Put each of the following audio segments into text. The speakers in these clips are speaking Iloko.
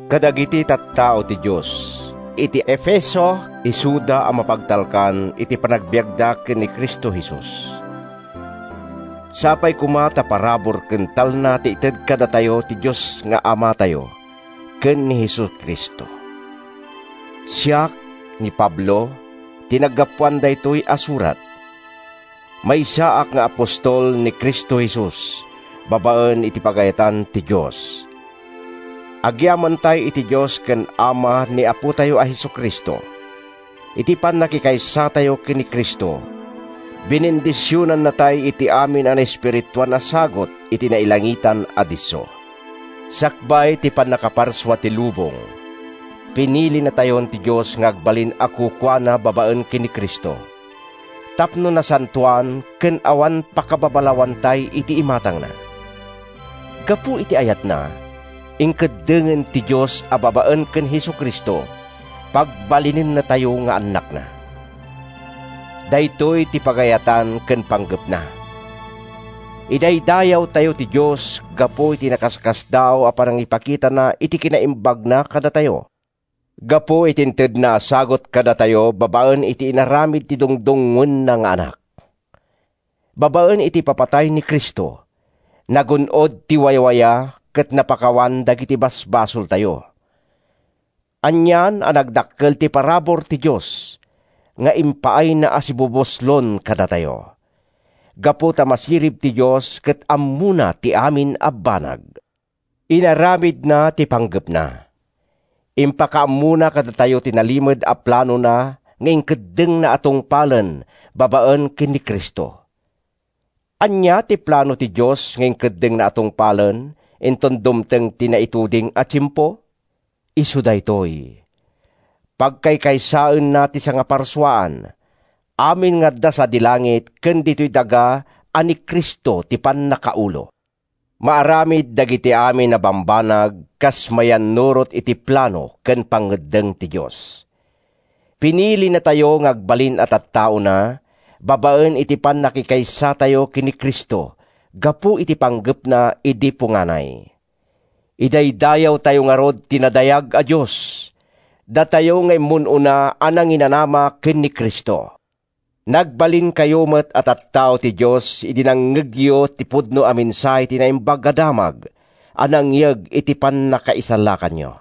Kadagiti tattao ti Dios isuda a mapagtalkan iti panagbiagda ken ni Cristo Jesus. Sapay koma ta parabur ken talna ti ited kadakayo ti Dios nga Amatayo ken ni Jesu-Cristo. Siak, ni Pablo, ti naggapuan daytoy a surat. Maysaak nga apostol ni Cristo Jesus babaen iti pagayatan ti Dios. Agyamantay iti Dios ken Ama ni Apotayo a Jesu-Cristo! Iti pannakikaysatayo ken ni Cristo, binendisionannatay iti amin a naespirituan a sagut iti nailangitan a disso. Sakbay ti pannakaparsua ti lubong, pinilinatayon ti Dios nga agbalin a kukuana babaen ken ni Cristo, tapno nasantoan ken awan pakababalawantay iti imatangna. Gapu iti ayatna, inkeddengen ti Dios a babaen ken Jesu-Cristo, pagbalinennatayo nga annakna. Daytoy ti pagayatan ken panggepna. Idaydayawtayo ti Dios gapu iti nakaskasdaaw a panangipakitana iti kinaimbagna kadatayo, gapu iti intedna a sagut kadatayo babaen iti inaramid ti dungdungngoenna nga Anak. Babaen iti ipapatay ni Cristo, nagun-od ti wayawaya ket napakawan dagiti basbasoltayo. Anian a nagdakkel ti parabur ti Dios nga impaayna a sibubuslon kadatayo! Gapu ta masirib ti Dios ket ammona ti amin a banag, inaramidna ti pinanggepna. Impakaammona kadatayo ti nalimed a planona nga inkeddengna a tungpalen babaen ken ni Cristo. Ania ti plano ti Dios nga inkeddengna a tungpalen inton dumteng ti naituding a tiempo? Isu daytoy: pagkaykaysaenna ti sangaparsuaan, amin nga adda sadi langit ken ditoy daga a ni Cristo ti pannakaulo. Maaramid dagiti amin a bambanag kas mayannurot iti plano ken pangngeddeng ti Dios. Pinilinatayo nga agbalin a tattaona babaen iti pannakikaysatayo ken ni Cristo gapu iti panggepna idi punganay. Idaydayawtayo ngarud ti nadayag a Dios, datayo nga immun-una a nanginanama ken ni Cristo. Nagbalinkayo met a tattao ti Dios idi nangngegyo ti pudno a mensahe, ti Naimbag a Damag a nangyeg iti pannakaisalakanyo.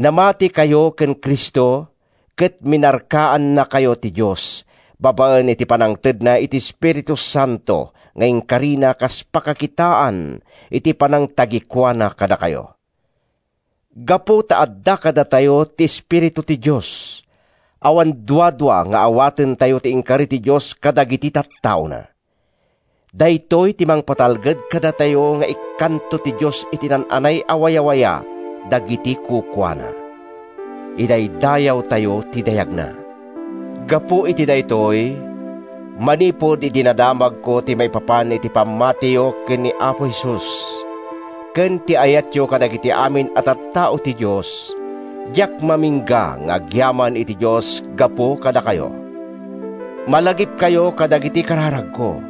Namatikayo ken Cristo ket minarkannakayo ti Dios babaen iti pannangtedna iti Espiritu Santo nga inkarina kas pakakitaan iti panangtagikuana kadakayo. Gapu ta adda kadatayo ti Espiritu ti Dios, awan duadua nga awatentayo ti inkari ti Dios kadagiti tattaona. Daytoy ti mangpatalged kadatayo nga ikkanto ti Dios iti naan-anay a wayawaya dagiti kukuana. Idaydayawtayo ti dayagna! Gapu iti daytoy, manipud idi nadamagko ti maipapan iti pammatiyo ken ni Apo Jesus, ken ti ayatyo kadagiti amin a tattao ti Dios, diak mamingga nga agyaman iti Dios gapu kadakayo. Malagipkayo kadagiti kararagko,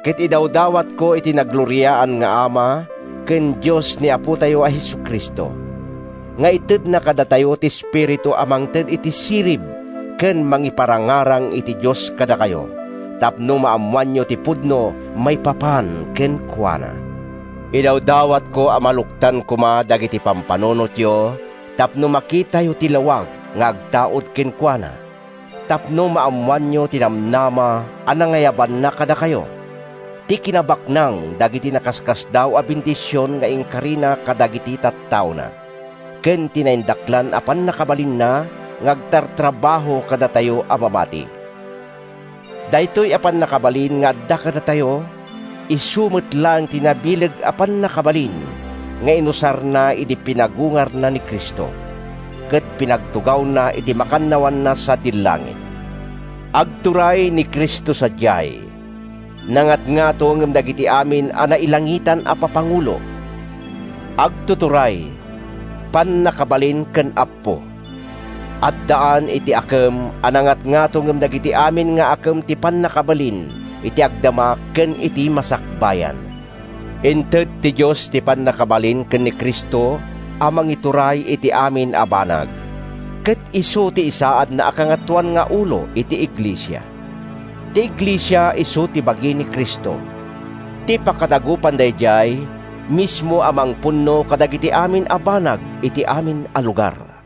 ket idawdawatko iti nagloriaan nga Ama ken Dios ni Apotayo a Jesu-Cristo, nga itedna kadakayo ti Espiritu a mangted iti sirib ken mangiparangarang iti Dios kadakayo tapno maammoanyo ti pudno maipapan kenkuana. Idawdawatko a maluktan koma dagiti pampanunotyo tapno makitayo ti lawag nga agtaud kenkuana, tapno maammoanyo ti namnama a nangayabanna kadakayo, ti kinabaknang dagiti nakaskasdaaw a bendision nga inkarina kadagiti tattaona ken ti naindaklan a pannakabalinna nga agtartrabaho kadatayo a mamati. Daytoy a pannakabalin nga adda kadatayo, isu met laeng ti nabileg a pannakabalin nga inusarna idi pinagungarna ni Cristo, ket pinagtugawna iti makannawanna sadi langit. Agturay ni Cristo sadiay. Nangatngato ngem dagiti amin a nailangitan a papangulo, agtuturay, pannakabalin ken appo. Addaan iti akem a nangatngato ngem dagiti amin nga akem ti pannakabalin iti agdama ken iti masakbayan. Inted ti Dios ti pannakabalin ken ni Cristo a mangituray iti amin a banag, ket isu ti insaadna a kangatoan nga ulo iti iglesia. Ti iglesia isu ti bagi ni Cristo, ti pakadagupan daydiay mismo a mangpunno kadagiti amin a banag iti amin a lugar.